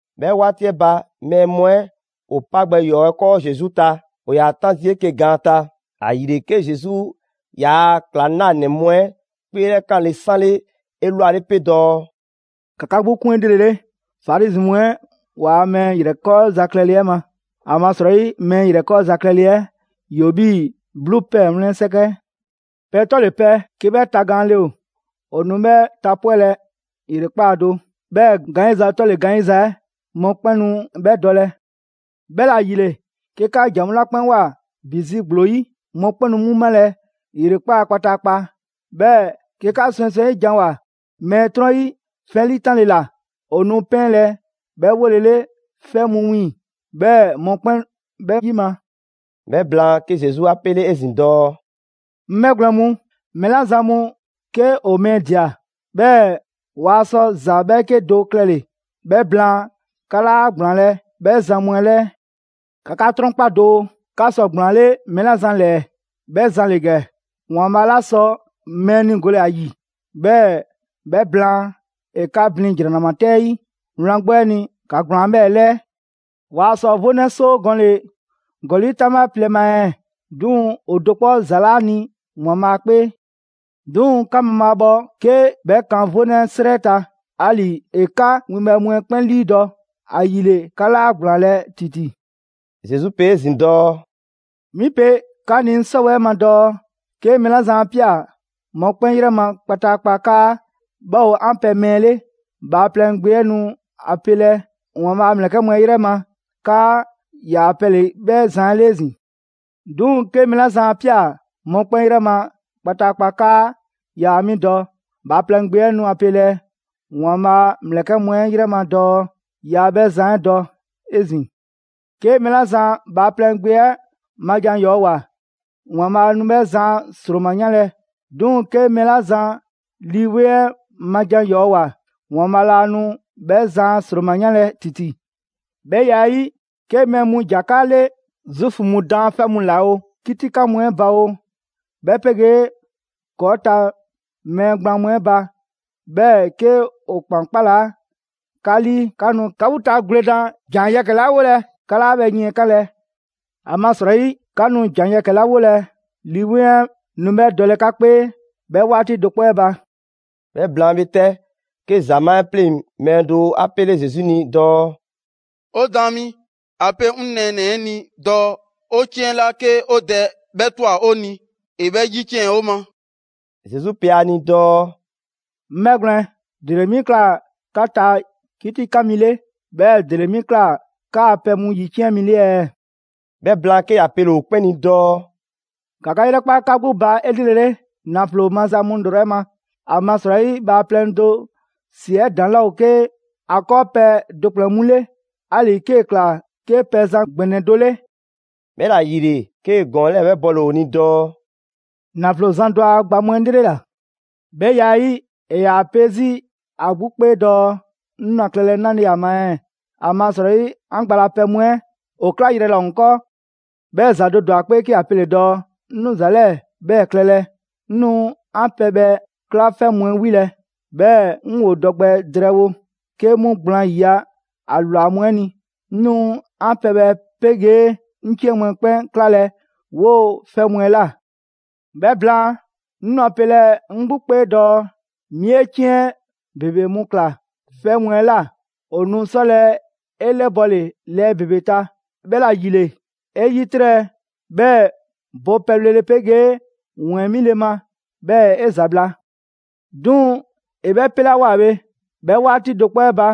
'Bhɛ 'waati 'ɛ ba, mɛɛ mu 'ɛ ‑o 'pa gbɛ ‑yɔɔ 'ɛ 'kɔɔ Zesu ta, ‑o ‑yaa 'tan zii' 'eke‑ gaan ta. ‑Ayile, 'ke Zesu ‑yaa' ‑klaŋlanɛ mu 'ɛ 'kpeelɛkanle 'sanle 'elwale 'pe dɔɔ: «‑Ka 'ka 'gbu 'kun 'elrele Farizi mu 'ɛ waa mɛɛ ‑yrɛkɔɔza klɛle 'ɛ ma. ‑Amasrɔyi, mɛɛ ‑yrɛkɔɔza klɛle 'ɛ ‑yoo 'bhii‑ 'bluu ‑pɛɛ 'wlɛn 'sɛkɛ. Pɛ 'tɔle‑ pɛ 'ke 'bhɛ tagaanle ‑o, ‑o nu 'bhɛ tapwɛlɛ ‑yrekpaa' do; 'bhɛɛ‑ gaanyiza 'tɔle‑ gaanyiza 'ɛ, mɔkpɛn' nu 'bhɛ dɔlɛ. 'Bhɛla‑ ‑yile, 'ke 'ka ‑jan mu 'la 'kpɛn ꞊woa ‑bi zi ‑gblo 'yi, mɔkpɛn' nu 'mu malɛ ‑yrekpaa' kpataakpa. 'Bhɛɛ‑ 'ke 'ka swɛŋswɛŋ 'yi janwoa‑ mɛɛ 'trɔn 'yi 'fɛ ‑liitanle ‑la, ‑o nu 'pɛɛnlɛ‑ 'bhɛ 'wolele 'fɛ mu wiiŋ‑; 'bhɛɛ‑ mɔkpɛn' 'bhɛ 'yima‑.» 'Bhɛ blaan, 'ke Zesu 'a 'pele 'ezin‑ dɔɔ: «'Ŋ 'bhɛgwlɛn‑ mu, mɛɛ 'la zan mu 'ke ‑o mɛɛ ꞊dia, 'bhɛɛ‑ waa sɔ ‑za 'bhɛɛke do klɛle‑ 'bhɛ blaan 'ka 'laa ‑gblaanlɛ' 'bhɛ zan mu 'ɛ 'lɛɛ. ‑Ka 'ka 'trɔnkpa doo, 'ka sɔ ‑gblaanle' mɛɛ 'la zan 'lɛɛ‑, 'bhɛ zan ‑le ‑gɛ: ‑Waanbhaa' 'la sɔ mɛɛ 'niigole ‑a ‑yi, 'bhɛɛ‑ 'bhɛ blaan, ‑e 'ka blin ‑jranama 'tɛ 'yi. Wlan 'gbu 'ɛ ni, ‑ka ‑gblaan 'bhɛɛ‑ 'lɛɛ.» «Waa sɔ 'vonɛ 'soo gɔnle‑ ‑gɔli' 'taŋbha plɛ ma ɛɛ? 'Duŋ‑ ‑o do 'kpɔ ‑za 'laa ni ‑Waanbhaa' 'kpee. 'Duŋ‑ 'ka mabhaabhɔ 'ke 'bhɛ kan 'vonɛ 'srɛ ta. Ali‑, ‑e 'ka 'wiiŋ‑ winbhɛ mu 'ɛ 'kpɛn 'liidɔ‑. ‑Ayile 'ka 'laa ‑gblaanlɛ' ‑titi.» Zesu pe 'ezin‑ dɔɔ: «'Mi pe 'ka ni 'ŋ 'sɔwɛɛ ma dɔɔ: 'ke mɛɛ 'la zan 'a ꞊pia mɔkpɛn' 'yrɛ ma kpataakpa 'kaa 'bhɛ ‑o 'an pɛ mɛɛ 'le, Bhaaplɛŋ Gbe 'ɛ nu a pelɛ ‑Waanbhaa' a ‑mlɛkɛ' mu 'ɛ 'yrɛ ma 'kaa ‑yaa pɛ ‑le 'bhɛ zan 'ɛ 'le 'ezin‑. 'Duŋ‑ 'ke mɛɛ 'la zan 'a ꞊pia mɔkpɛn' 'yrɛ ma kpataakpa 'kaa yaa 'mi dɔ, Bhaaplɛŋ Gbe 'ɛ nu a pelɛ ‑Waanbhaa' a ‑mlɛkɛ' mu 'ɛ yrɛ ma dɔɔ yaa 'bhɛ zan 'ɛ dɔ 'ezin‑. 'Ke mɛɛ 'la zan Bhaaplɛŋ Gbe 'ɛ ma jan ‑yɔɔ ꞊woa, ‑Waanbhaa' nu 'bhɛ zan a ‑sroma 'yanlɛ‑. 'Duŋ‑ 'ke mɛɛ 'la zan Lii 'Weŋ 'ɛ ma jan ‑yɔɔ' ꞊woa, ‑Waanbhaa' 'laa nu 'bhɛ zan a ‑sroma 'yanlɛ‑ ‑titi.» «'Bhɛ ya 'ɛ 'yi, 'ke mɛɛ mu ‑ja 'ka 'le Zuufu mu daanfɛ' mu ꞊la oo, 'kitikan mu 'ɛ ba oo, 'bhɛ 'pegee ‑kɔɔ' ta mɛɛ gblaan mu 'ɛ ba. 'Bhɛɛ‑ 'ke ‑o ‑kpan ‑kpalaa' 'ka 'lii, 'ka nu 'ka 'gbu ta gwledan ‑jan yɛkɛ‑ 'la 'wolɛ‑ 'ka 'laa 'bhɛ yiɛnkanlɛ. ‑Amasrɔyi, 'ka nu ‑jan yɛkɛ‑ 'la 'wolɛ‑, Lii 'Weŋ 'ɛ nu 'bhɛ dɔlɛ 'ka 'kpee 'bhɛ 'waati do 'kpɔ 'ɛ ba.» 'Bhɛ blaan bhe 'tɛ, 'ke ‑zamaa' 'ɛ 'pleŋ‑ mɛɛ do 'a 'pele Zesu ni dɔɔ: «'O Daan mi, ‑a pe 'ŋ nɛɛnɛ‑ 'ɛ ni dɔɔ 'o 'ciɛn 'la 'ke 'o dɛ 'bhɛ ꞊twa 'o ni, ‑e 'bhɛ ‑yiciɛn' 'o ma.» Zesu pe ‑a ni dɔɔ: «'Ŋ 'bhɛgwlɛn‑, ‑dele 'mi ꞊kla 'ka ta 'kitikan mi 'le, 'bhɛɛ‑ ‑dele 'mi ꞊kla 'kaa‑ pɛ mu ‑yiciɛn' mi 'le ɛɛ?» 'Bhɛ blaan, 'ke ‑ya pele‑ ‑o 'kpɛn ni dɔɔ: «‑Ka 'ka 'yrɛkpa 'ka 'gbu ba 'elrele ‑naflo maza mu ‑lrɔ 'ɛ ma. ‑Amasrɔyi bhaaplɛŋ do ‑si 'ɛ ‑daŋ' 'laa 'ke ‑a 'kɔɔpɛ‑ do ‑kplɛn mu 'le, 'ali‑ 'kee‑ ꞊kla 'ke pɛzan ‑gbɛnɛ do 'le.» 'Bhɛla‑ ‑yile, 'kee‑ ‑gɔɔn 'lɛɛ‑ 'bhɛ bɔle‑ ‑o ni dɔɔ: «‑Naflo zan do a gba mu 'ɛ 'lrela‑. 'Bhɛ ya 'ɛ 'yi, ‑e ‑yaa pe 'zi ‑a 'gbu 'kpee dɔɔ: ‹'Ŋ nu ‑a klɛlɛ 'nale‑ ‑a ma ɛɛ, ‑amasrɔyi 'an gba la pɛ mu 'ɛ ‑o 'klayrɛ‑ laa ‑o 'ŋ 'kɔɔ.› 'Bhɛɛ‑ ‑za do ‑dwa ‑a 'kpee 'ke ‑ya pele‑ dɔɔ: ‹'Ŋ nu ‑za 'lɛɛ‑ 'bhɛɛ‑ klɛlɛ. 'Ŋ nu 'an pɛbhɛ 'kla 'fɛ mu 'ɛ 'wilɛ‑, 'bhɛɛ‑ 'ŋ ‑wo dɔ gbɛ drɛɛ wo 'ke mu gblaan 'yiya‑ ‑a ‑lwa mu 'ɛ ni. 'Ŋ nu 'an pɛbhɛ 'pegee 'ŋ 'ciɛn mu 'ɛ 'kpɛn 'klalɛ‑ 'woo‑ 'fɛ mu 'ɛ ꞊la. 'Bhɛ blaan, 'ŋ nu ‑a pelɛ 'ŋ 'gbu 'kpee dɔɔ: 'Mi 'e 'ciɛn ‑bebe mu ꞊klaa 'fɛ mu 'ɛ ꞊la, ‑o nu 'sɔlɛ‑ 'e 'lɛbɔle lɛɛ ‑bebe ta. 'Bhɛla‑ ‑yile, 'e 'yitrɛ‑, 'bhɛɛ‑ bo pɛbhlele 'pegee ‑wɛɛn 'mile ma, 'bhɛɛ‑ 'e ‑zabla'.› 'Duŋ‑ ‑e 'bhɛ 'pelawoa bhe, 'bhɛ 'waati do 'kpɔ 'ɛ ba,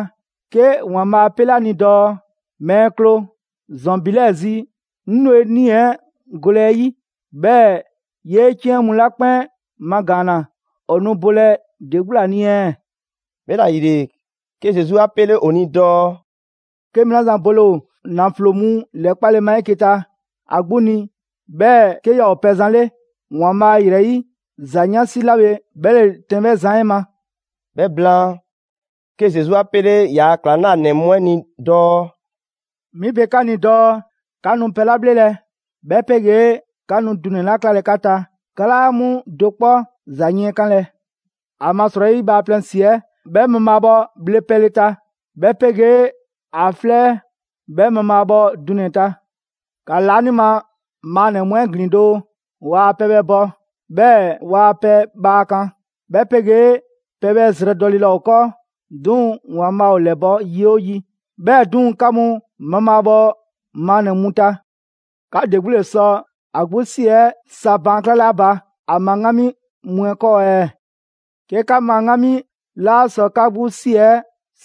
'ke ‑Waanbhaa' 'a 'pele ‑a ni dɔɔ: ‹Mɛɛ kloo, ‑zɔn ‑bi 'lɛɛ‑ zi, 'ŋ nu 'e 'nii‑ 'ɛ golɛ 'e 'yi. 'Bhɛɛ‑ 'yee 'ciɛn mu 'la 'kpɛn magaanna ‑o nu bolɛ ‑de 'gbu ‑la ni ɛɛ?›» 'Bhɛla‑ ‑yile, 'ke Zesu 'a pele ‑o ni dɔɔ: «'Ke mɛɛ 'la zan bole ‑o ‑naflo mu ‑lɛkpale ma 'eke‑ ta ‑a 'gbu ni, 'bhɛɛ‑ 'ke yaa ‑o pɛzan 'le ‑Waanbhaa' ‑yrɛ 'yi, ‑za 'yansi 'la bhe 'bhɛ ‑le tɛn 'bhɛ zan 'ɛ ma.» 'Bhɛ blaan, 'ke Zesu 'a pele ‑yaa' ‑klaŋlanɛ mu 'ɛ ni dɔɔ: «'Mi pe 'ka ni dɔɔ 'ka nu pɛ 'la 'bhlelɛ‑, 'bhɛ 'pegee 'ka nu dunɛ‑ 'la klalɛ 'ka ta, 'ka 'laa 'mu do 'kpɔ ‑za yiɛnkanlɛ. ‑Amasrɔyi bhaaplɛŋ ‑si 'ɛ 'bhɛ mabhaabhɔ bhle pɛle ta, 'bhɛ 'pegee ‑a 'flɛ 'bhɛ mabhaabhɔ dunɛ‑ ta. ‑Ka laanima maannɛ‑ mu 'ɛ ‑glin doo! Waa pɛbhɛ bɔ, 'bhɛɛ‑ waa pɛ bhaa kan. 'Bhɛ 'pegee pɛbhɛ zrɛ dɔle laa ‑o 'kɔɔ, 'duŋ‑ ‑Waanbhaa' ‑o ‑lɛbɔ' yi 'oo yi. 'Bhɛɛ‑ 'duŋ‑, 'ka mu mabhaabhɔ maannɛ‑ mu ta. 'Ka ‑de 'gbu ‑le sɔ ‑a 'gbu ‑si 'ɛ sa baan 'klale ‑a ba ‑a ma 'ŋgami mu 'ɛ 'kɔɔ ɛɛ? 'Ke 'ka ma 'ŋgami 'laa sɔ 'ka 'gbu 'si 'ɛ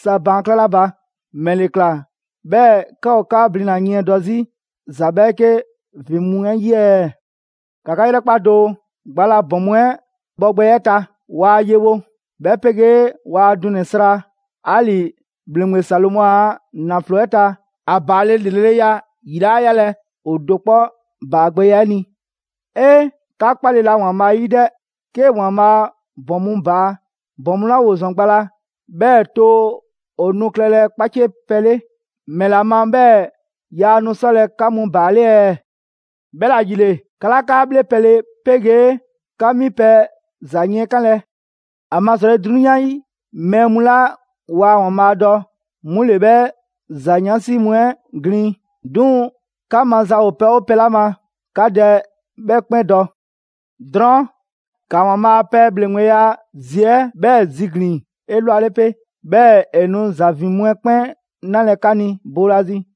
sa baan' 'klale ‑a ba, ‑mɛle ꞊kla 'bhɛɛ‑ 'ka ‑o 'ka blina‑ yiɛndɔ 'zi ‑za 'bhɛɛke ‑vin mu 'ɛ 'yi ɛɛ? ‑Ka 'ka 'yrɛkpa doo, gba la ‑bɔn mu 'ɛ 'bhɔgbɛya 'ɛ ta. Waa yewo, 'bhɛ 'pegee waa dunɛ‑ sra. 'Ali‑ ‑bhleŋgbe Salomɔ a ‑nafloya 'ɛ ta, ‑a ‑baale' ‑lreleya ‑yi 'laa 'yalɛ‑ ‑o do 'kpɔ ‑baagbɛya 'ɛ ni. 'Ee! 'Ka 'kpale‑ la ‑Waanbhaa' 'yi 'dɛ! 'Ke ‑Waanbhaa' ‑bɔn mu baa, ‑bɔn mu 'la ‑woo ‑zɔn gba la, 'bhɛɛ‑ too ‑o nu klɛlɛ 'kpaciepɛ 'le. ‑Mɛla ma 'bhɛɛ‑ yaa nu 'sɔlɛ‑ 'ka mu ‑baale' ɛɛ? 'Bhɛla‑ ‑yile, 'ka 'laa 'ka 'bhle pɛle 'pegee 'ka 'mi pɛ ‑za yiɛnkanlɛ. ‑Amasrɔyi, 'drunyan 'yi mɛɛ mu 'la waa ‑Waanbhaa' dɔ, 'mu ‑le 'bhɛ ‑za 'yansi mu 'ɛ ‑glin. 'Duŋ‑ 'ka maza ‑o pɛ 'oo pɛ 'la ma, 'ka Dɛ 'bhɛ 'kpɛn dɔ. Drɔɔn' ‑ka ‑Waanbhaa' a pɛ ‑bhleŋgbeya zi 'ɛ 'bhɛɛ‑ ziglin‑ 'elwale 'pe, 'bhɛɛ‑ ‑e nu ‑za ‑vin mu 'ɛ 'kpɛn 'nalɛ‑ 'ka ni boolazi.»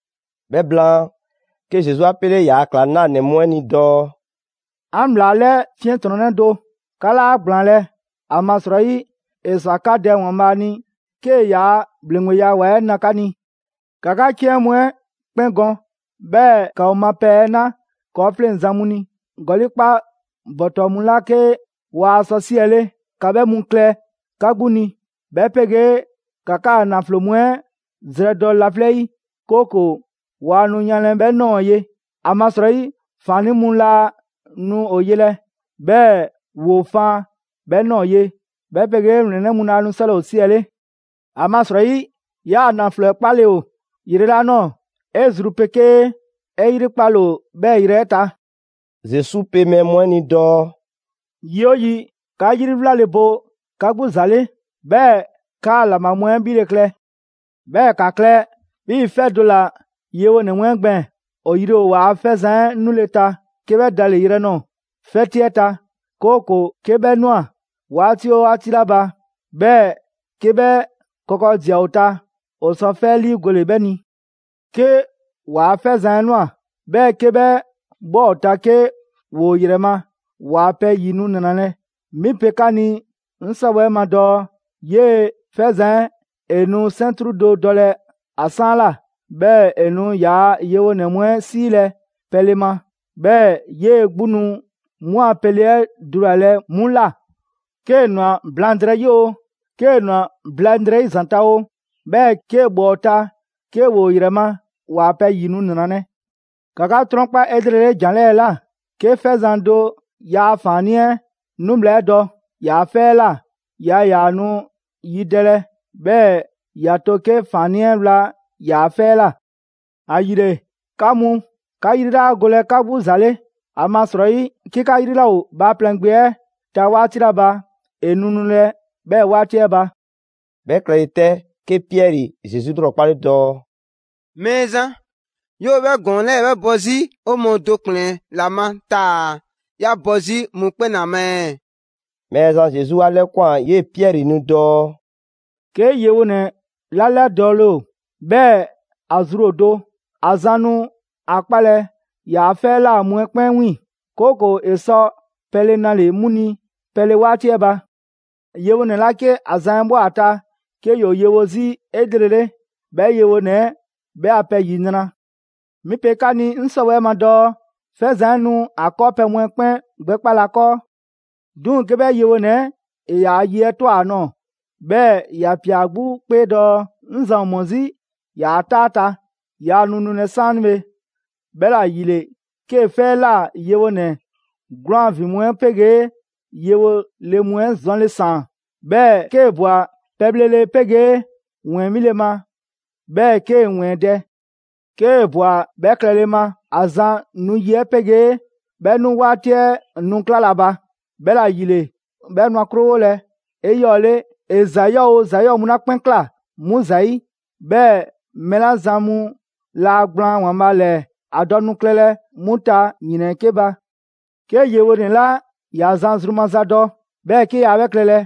'Bhɛ blaan, 'ke Zesu 'a 'pele ‑yaa' ‑klaŋlanɛ mu 'ɛ ni dɔɔ: «'An ‑bhlaa 'lɛ 'fiɛntrɔnnɛ do, 'ka 'laa ‑gblaanlɛ'! ‑Amasrɔyi, ‑e ‑swa 'ka Dɛ ‑Waanbhaa' ni 'kee‑ yaa ‑bhleŋgbeya ‑wa 'ɛ na 'ka ni. ‑Ka 'ka 'ciɛn mu 'ɛ 'kpɛn gɔn, 'bhɛɛ‑ ‑ka ‑o ma pɛ 'ɛ 'na 'kɔɔfleŋzan mu ni. ‑Gɔli' 'kpa ‑bɔtɔ mu 'la 'ke waa sɔ 'siɛle, ‑ka 'bhɛ mu klɛ 'ka 'gbu ni, 'bhɛ 'pegee ‑ka 'kaa ‑naflo mu 'ɛ zrɛdɔ laflɛ' 'yi, 'kooko‑ waa nu yanlɛ 'bhɛ ꞊nɔɔ ye. ‑Amasrɔyi ‑faannii' mu laa nu ‑o yelɛ, 'bhɛɛ‑ ‑woo faan 'bhɛ ꞊nɔɔ ye, 'bhɛ 'pegee ‑wlɛnnɛ' mu laa nu 'sɔlɛ‑ ‑o 'siɛle. ‑Amasrɔyi 'yaa‑ ‑naflo 'ɛ 'kpale‑ ‑o yrɛ 'la ꞊nɔɔ, 'e zru 'pegee 'e 'yrikpale ‑o 'bhɛɛ‑ yrɛ 'ɛ ta.» Zesu pe mɛɛ mu 'ɛ ni dɔɔ: «Yi 'oo yi, 'ka 'yri 'wlale‑ bo 'ka 'gbu ‑za 'le, 'bhɛɛ‑ 'kaa‑ ‑laŋbha mu 'ɛ 'bhile‑ klɛ. 'Bhɛɛ‑ ‑ka klɛ 'bhii‑ 'fɛ do ‑la yewonɛ mu 'ɛ gbɛɛn‑. ‑O yri ‑o ‑waa' 'fɛzan‑ 'ɛ nule ta 'ke 'bhɛ da le dɔyrɛ ꞊nɔɔ 'fɛti 'ɛ ta. 'Kooko‑ 'ke 'bhɛ ꞊nwa 'waati 'oo 'waati 'la ba, 'bhɛɛ‑ 'ke 'bhɛ kɔkɔdia ‑o ta, ‑o sɔ 'fɛ 'ɛ 'liigole 'bhɛ ni. 'Ke ‑waa' 'fɛzan‑ 'ɛ ꞊nwa, 'bhɛɛ‑ 'ke 'bhɛ ꞊bhwa ‑o ta 'ke ‑woo ‑o ‑yrɛ ma, ‑waa pɛ ‑yi nu ‑nralɛ'. 'Mi pe 'ka ni 'ŋ 'sɔwɛɛ‑ 'ɛ ma dɔɔ 'yee‑ 'fɛzan‑ 'ɛ ‑e nu 'sɛntru do dɔlɛ ‑a 'saanla꞊, 'bhɛɛ‑ ‑e nu ‑yaa' yewonɛ mu 'ɛ 'siilɛ‑ pɛle ma, 'bhɛɛ‑ 'yee‑ 'gbu nu 'mu a pɛle 'ɛ dulalɛ 'mu ꞊la. 'Kee‑ ꞊nwa blaŋdrɛyi 'oo, 'kee‑ ꞊nwa blaŋdrɛyi ‑zanta' oo, 'bhɛɛ‑ 'kee‑ ꞊bhwa ‑o ta 'ke ‑woo ‑yrɛ ma, ‑waa pɛ ‑yi nu ‑nralɛ'.» «‑Ka 'ka 'trɔnkpa 'elrele ‑jan 'lɛɛ‑ ꞊la: 'Ke 'fɛzan‑ do ‑yaa ‑faannii' 'ɛ nu 'bhla 'ɛ dɔ ‑yaa' 'fɛ 'ɛ ꞊la, yaa ‑yaa nu yidɛlɛ, 'bhɛɛ‑ ‑ya to 'ke ‑faannii' 'ɛ wla ‑yaa' 'fɛ 'ɛ ꞊la. ‑Ayile, 'ka mu, 'ka 'yri 'laa golɛ 'ka 'gbu ‑za le. ‑Amasrɔyi 'ke 'ka 'yri 'laa ‑o Bhaaplɛŋ Gbe 'ɛ ta 'waati 'la ba, ‑e nu nulɛ 'bhɛɛ‑ 'waati 'ɛ ba.» 'Bhɛ klɛle 'tɛ, 'ke Piɛri Zesu 'lrɔkpale dɔɔ: «Mɛɛzan, 'yoo‑ 'bhɛ ‑gɔɔn 'lɛɛ‑ 'bhɛ bɔ 'zi 'o mɔɔ do ‑kplɛn ‑la ma taa‑ 'ya bɔ 'zi mɔkpɛn' ‑la ma ɛɛ?» Mɛɛzan Zesu 'a 'lɛkwan‑ 'yee‑ Piɛri ni dɔɔ: «'Ke yewonɛ 'la 'lɛdɔɔle ‑o, 'bhɛɛ‑ ‑a zru ‑o do, ‑a zan nu 'a 'kpalɛ‑ ‑yaa' 'fɛ 'ɛ ꞊la mu 'ɛ 'kpɛn 'wiiŋ‑; 'kooko‑ ‑e sɔ pɛle nale‑ 'mu ni pɛle 'waati 'ɛ ba. Yewonɛ 'la 'ke ‑a zan 'ɛ ꞊bhwa ‑a ta 'ke ‑yoo yewo 'zi 'elrele, 'bhɛ yewonɛ 'ɛ 'bhɛ a pɛ ‑yinra'. 'Mi pe 'ka ni 'ŋ 'sɔwɛɛ‑ ma dɔɔ 'fɛzan‑ 'ɛ nu ‑a 'kɔɔpɛ‑ mu 'ɛ 'kpɛn gbɛkpalɛ ‑a 'kɔɔ. 'Duŋ‑ 'ke 'bhɛ yewonɛ 'ɛ ‑e ‑yaa' ye 'ɛ ꞊twa ‑a nɔɔ‑, 'bhɛɛ‑ ‑ya ꞊pia ‑a 'gbu 'kpee dɔɔ: ‹'Ŋ zan ‑o ‑mɔ 'zi ‑yaa' 'taa 'ɛ ta, yaa nu nulɛ 'saanibhe.› 'Bhɛla ‑yile 'kee‑ 'fɛ 'ɛ ꞊la yewonɛ 'gwlaan‑ ‑vin mu 'ɛ 'pegee yewo le mu 'ɛ zɔnle ‑saan, 'bhɛɛ‑ 'kee‑ ꞊bwa pɛbhlele 'pegee ‑wɛɛn 'mile‑ ma, 'bhɛɛ‑ 'kee‑ ‑wɛɛn dɛ. 'Kee‑ ꞊bwa 'bhɛɛ‑ klɛle ma, ‑a zan nu yi 'ɛ 'pegee 'bhɛ 'nu 'waati 'ɛ nu 'klalɛ‑ ‑a ba. 'Bhɛla‑ ‑yile, 'bhɛ nu ‑a 'krowolɛ 'eyɔɔle ‑e ‑za 'yɔɔ‑ oo ‑za 'yɔɔ‑ mu 'la 'kpɛn ꞊kla 'mu ‑zayi'. 'Bhɛɛ‑ mɛɛ 'la zan mu laa gblaan ‑Waanbhaa' ‑lɛɛ ‑a dɔ nu klɛlɛ 'mu ta ‑yrɛn 'ɛ 'ke ba.» «'Ke yewonɛ 'la ‑ya zan zru maza dɔ, 'bhɛɛ‑ 'ke yaa 'bhɛ klɛlɛ,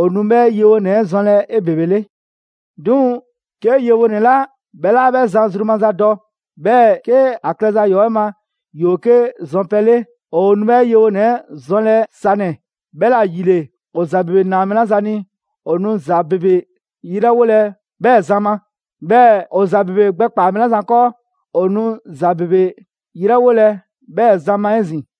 ‑o nu 'bhɛ yewonɛ 'ɛ zɔnlɛ 'ebebele. 'Duŋ‑ 'ke yewonɛ 'la 'bhɛ 'laa 'bhɛ zan zru maza dɔ, 'bhɛɛ‑ 'ke ‑a klɛza ‑yɔɔ' 'ɛ ma ‑yoo 'ke zɔnpɛ 'le; ‑o nu 'bhɛ yewonɛ 'ɛ zɔnlɛ sanɛ‑. 'Bhɛla‑ ‑yile, ‑o ‑za ‑bebe ‑naa mɛɛ 'la zan ni, ‑o nu ‑za ‑bebe 'yrɛwolɛ 'bhɛɛ‑ zan ma. 'Bhɛɛ‑ ‑o ‑za ‑bebe gbɛkpaa‑ mɛɛ 'la zan 'kɔɔ, ‑o nu ‑za ‑bebe 'yrɛwolɛ 'bhɛɛ‑ zan ma 'ezin‑.»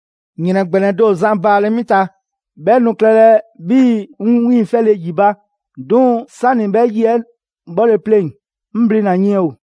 ‑Yrɛn ‑gbɛnɛ do ‑o zan baalɛ 'mi ta, 'bhɛ nu klɛlɛ 'bhii‑ 'ŋ 'wiiŋfɛle ‑yi ba. 'Duŋ‑ 'sani‑ 'bhɛ yi 'ɛ 'bhɔle‑ pleŋ‑, 'ŋ blina‑ yiɛn ‑o.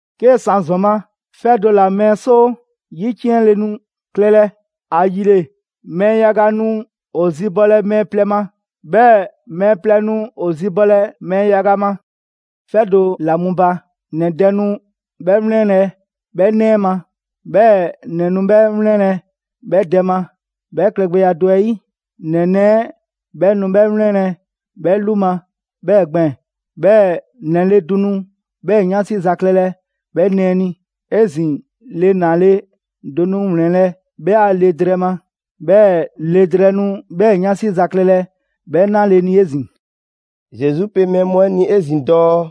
'Kee‑ san ‑zɔn ma, 'fɛ do ‑la mɛɛ 'soo 'yiciɛnle nu klɛlɛ. ‑Ayile, mɛɛ yaga nu ‑o zibɔlɛ mɛɛ plɛ ma, 'bhɛɛ‑ mɛɛ plɛ nu ‑o zibɔlɛ mɛɛ yaga ma. 'Fɛ do ‑la mu ba, ‑nɛ dɛ nu 'bhɛ 'wlɛnlɛ‑ 'bhɛ 'nɛ 'ɛ ma, 'bhɛɛ‑ ‑nɛ nu 'bhɛ 'wlɛnlɛ 'bhɛ dɛ ma. 'Bhɛ klɛgbɛya do 'ɛ 'yi, ‑nɛ nɛɛ 'ɛ 'bhɛ nu 'bhɛ 'wlɛnlɛ‑ 'bhɛ 'lu ma 'bhɛɛ‑ gbɛɛn‑. 'Bhɛɛ‑ ‑nɛ le do nu 'bhɛɛ‑ 'yansi za klɛlɛ 'bhɛ nɛɛ ni. 'Ezin‑ le ‑naale' do nu ‑wlɛnlɛ' 'bhɛ a le drɛɛ ma, 'bhɛɛ‑ le drɛɛ nu 'bhɛɛ‑ 'yansi za klɛlɛ 'bhɛ 'naale‑ ni 'ezin‑.» Zesu pe mɛɛ mu 'ɛ ni 'ezin‑ dɔɔ: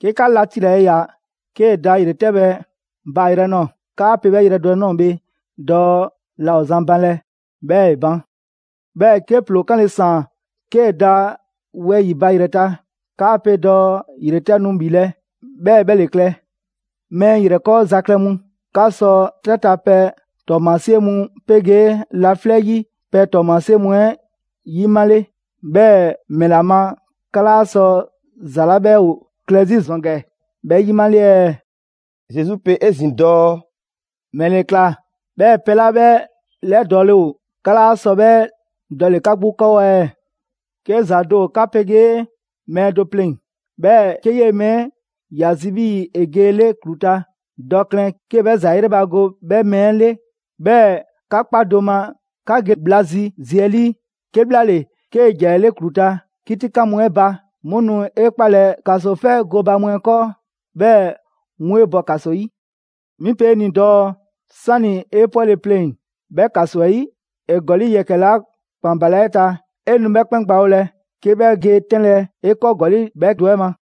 «'Ke 'ka la tilale ꞊ya 'kee‑ da ‑yretɛbhɛ baayrɛ nɔɔ‑, 'kaa pe 'bhɛ yrɛ do 'ɛ ꞊nɔɔ bhe dɔɔ la ‑o zan banlɛ. 'Bhɛɛ‑ ‑e ban. 'Bhɛɛ‑ 'ke ‑ploo 'kanle‑ ‑saan 'kee‑ da wɛyi‑ ba ‑yrɛ ta, 'kaa pe dɔɔ ‑yretɛ' nu ‑bhilɛ'. 'Bhɛɛ‑ 'bhɛ ‑le klɛ. Mɛɛ ‑yrɛkɔɔza klɛ mu, 'ka sɔ 'trɛ ta pɛ ‑tɔɔmasie mu 'pegee laflɛ' 'yi pɛ ‑tɔɔmasie mu 'ɛ ‑yimale, 'bhɛɛ‑ ‑mɛla ma 'ka 'laa sɔ ‑za 'la 'bhɛ ‑o klɛ 'zi ‑zɔn ‑gɛ 'bhɛ 'yimale ɛɛ?» Zesu pe 'ezin‑ dɔɔ: «‑Mɛle ‑kla 'bhɛɛ‑ pɛ 'la 'bhɛ 'lɛdɔɔle ‑o 'ka 'laa sɔ 'bhɛ dɔle‑ 'ka 'gbu 'kɔɔ ɛɛ? 'Ke ‑za do ‑o 'ka 'pegee mɛɛ do pleŋ‑, 'bhɛɛ‑ 'ke 'yee‑ mɛɛ 'ɛ ‑ya zi 'bhii‑ ‑e ge 'e 'le ‑klu ta, dɔ klɛn 'kee 'bhɛ ‑za 'ɛ 'yrɛbago 'bhɛ mɛɛ 'ɛ 'le, 'bhɛɛ‑ 'ka kpa do ma 'ka ge bhla zi zi 'ɛ 'lii. 'Kebhlaale, 'kee‑ ‑ja 'e 'le ‑klu ta, 'kitikan mu 'ɛ ba, 'mu nu 'e 'kpalɛ‑ ‑kasofɛ gooba mu 'ɛ 'kɔɔ, 'bhɛɛ‑ 'mu 'e bɔ ‑kaso 'yi. 'Mi pe 'e ni dɔɔ 'sani‑ 'e 'pwɛle‑ pleŋ‑ 'bhɛ ‑kaso 'ɛ 'yi, ‑e ‑gɔli' yɛkɛ‑ 'la ‑kpan ‑balaa' 'e ta, 'e nu 'bhɛ 'kpɛn gbawolɛ 'ke 'bhɛ ge 'tɛnlɛ‑ 'e 'kɔɔ ‑gɔli' bhɛ do 'ɛ ma.»